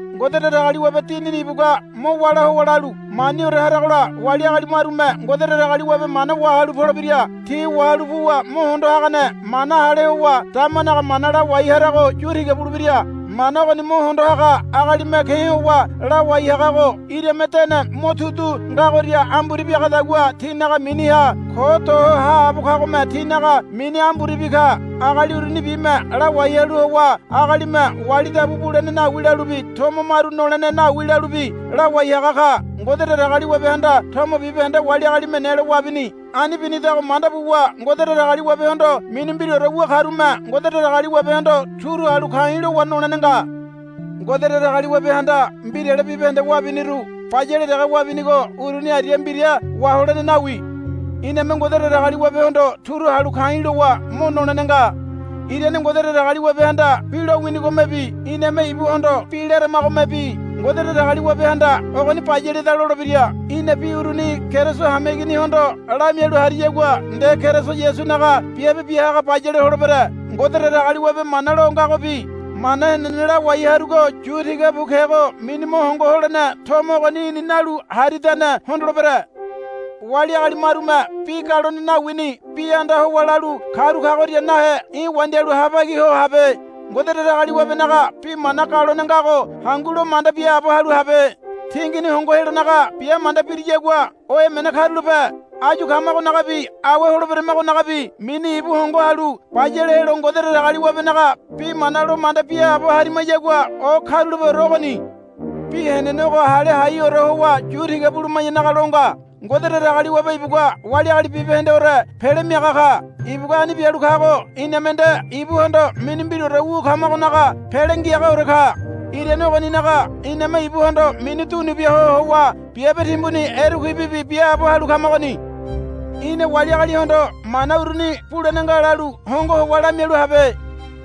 Ngode Datagaliwabe Dinini ibugua mo wála howa lalu, Maniore haragola wali agali marume Ngode Datagaliwabe mana wahalu polebira. Ti wahalu puwa mo hondo hagane mana hale howa damanaga mana lawai harago yu tiga bulebira. Mana ogoni mo hondo haga agalime ke̱ howa lawai hagago irame dene motudu ngagoria amburi biagadagua tinaga miniha ko do ho haabo kagome tinaga mini amburibi ka. Agali urunibime lawai halu howa agalime wali dabu bulene nawi lalubi tomo maru nolene nawi lalubi lawai haga ka. Ngode Datagaliwabehanda tomo bibahende wali agalime nelo wabini. Ani binidago manda buwa Ngode Datagaliwabehondo mini mbiraore wu karume Ngode Datagaliwabehondo turu halu ka̱i̱ lowa nolene nga. Ngode Datagaliwabehanda mbirale bibahende wabiniru bayale dege wabinigo uruni aria mbira waholene nawi. Iname Ngode Datagaliwabehondo turu halu ka̱i̱ lowa mo nolene nga. Irane Ngode Datagaliwabehanda bi lowinigomebi iname ibuhondo bi laramagomebi Ngode Datagaliwabehanda, Ogoni bayaleda, lolebira. Í̠na bi uruni Keriso hameiginihondo lamialu hariyagua nde Keriso Yasunaga biabe bia haga bayale holebere. Ngode Datagaliwabe mana lo ngagobi mana henene lawai harugo yu tiga bu kego mini mo hongo holene tomo ogoni í̠ni nalu haridane hondolebere. Wali agali marume bi galone nawini bi anda howa lalu karu kagoria nahe í̠ wandialu habagi ho habe. Ngode Datagaliwabenaga bi mana galone ngago hangu lo manda biaabo halu habe. Tingini hongo helonaga bia manda biriyagua o emene karulape. Áyu kamagonagabi awe holeberamagonagabi mini ibu hongo halu bayale helo Ngode Datagaliwabenaga bi mana lo manda biaabo harimayagua o karulapeore ogoni. Bi henene ogo hale haiore howa yu tiga buluma̱yanaga lo nga. Ngode Datagaliwabe ibugua wali agali bibahendeore Pele Miaga ka. Ibugua ani bialu kago iname nde ibuhondo mini mbiraore wu kamagonaga Pele Ngiagaore ka. Irane ogoninaga iname ibuhondo mini dunu bia ho howa biabe timbuni erekuibibi biaabo halu kamagoni. Í̠na wali agalihondo mana uruni, Bulene nga, lalu hongo howa lamialu habe.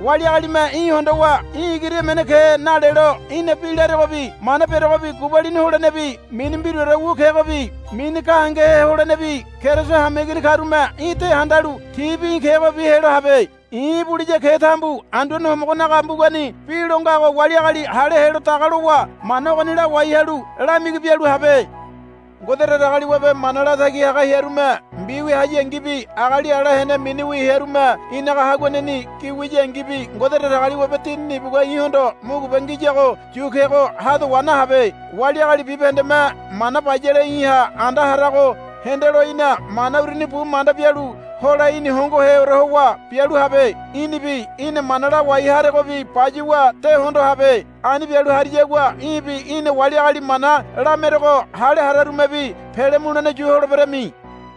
Wali agalime í̠ hondowa, Í̠ igiri emene ke, nalelo í̠na bi laregobi mana beregobi gubalini holenebi mini mbiraore wu kegobi mini gahengehe holenebi Keriso hameigini karume í̠ de handalu tibi í̠ kegobi helo habe. I̱ ibuliya ketambu Anduane Homogonaga mbugani bi lo ngago wali agali hale helo daga lowa mana ogoni lawai halu lamigi bialu habe. Ngode Datagaliwabe mana latagi haga hearume mbiwia hayangibi agali ala hene miniwi hearume í̠naga haguaneni gi wiyangibi Ngode Datagaliwabe Dinini ibugua í̠hondo mugube ngiyago yu kego ha do wa nahabe. Wali agali bibahendeme mana bayale í̠ha anda harago hendelo í̠na mana uruni bu manda bialu hole í̠ni hongoheore howa bialu habe. Í̠nibi í̠na mana lawai haregobi bayuwa de hondo habe. Ani bialu hariyagua í̠bi í̠na wali agali mana lamerego hale hararumebi pele mulene yu holeberami.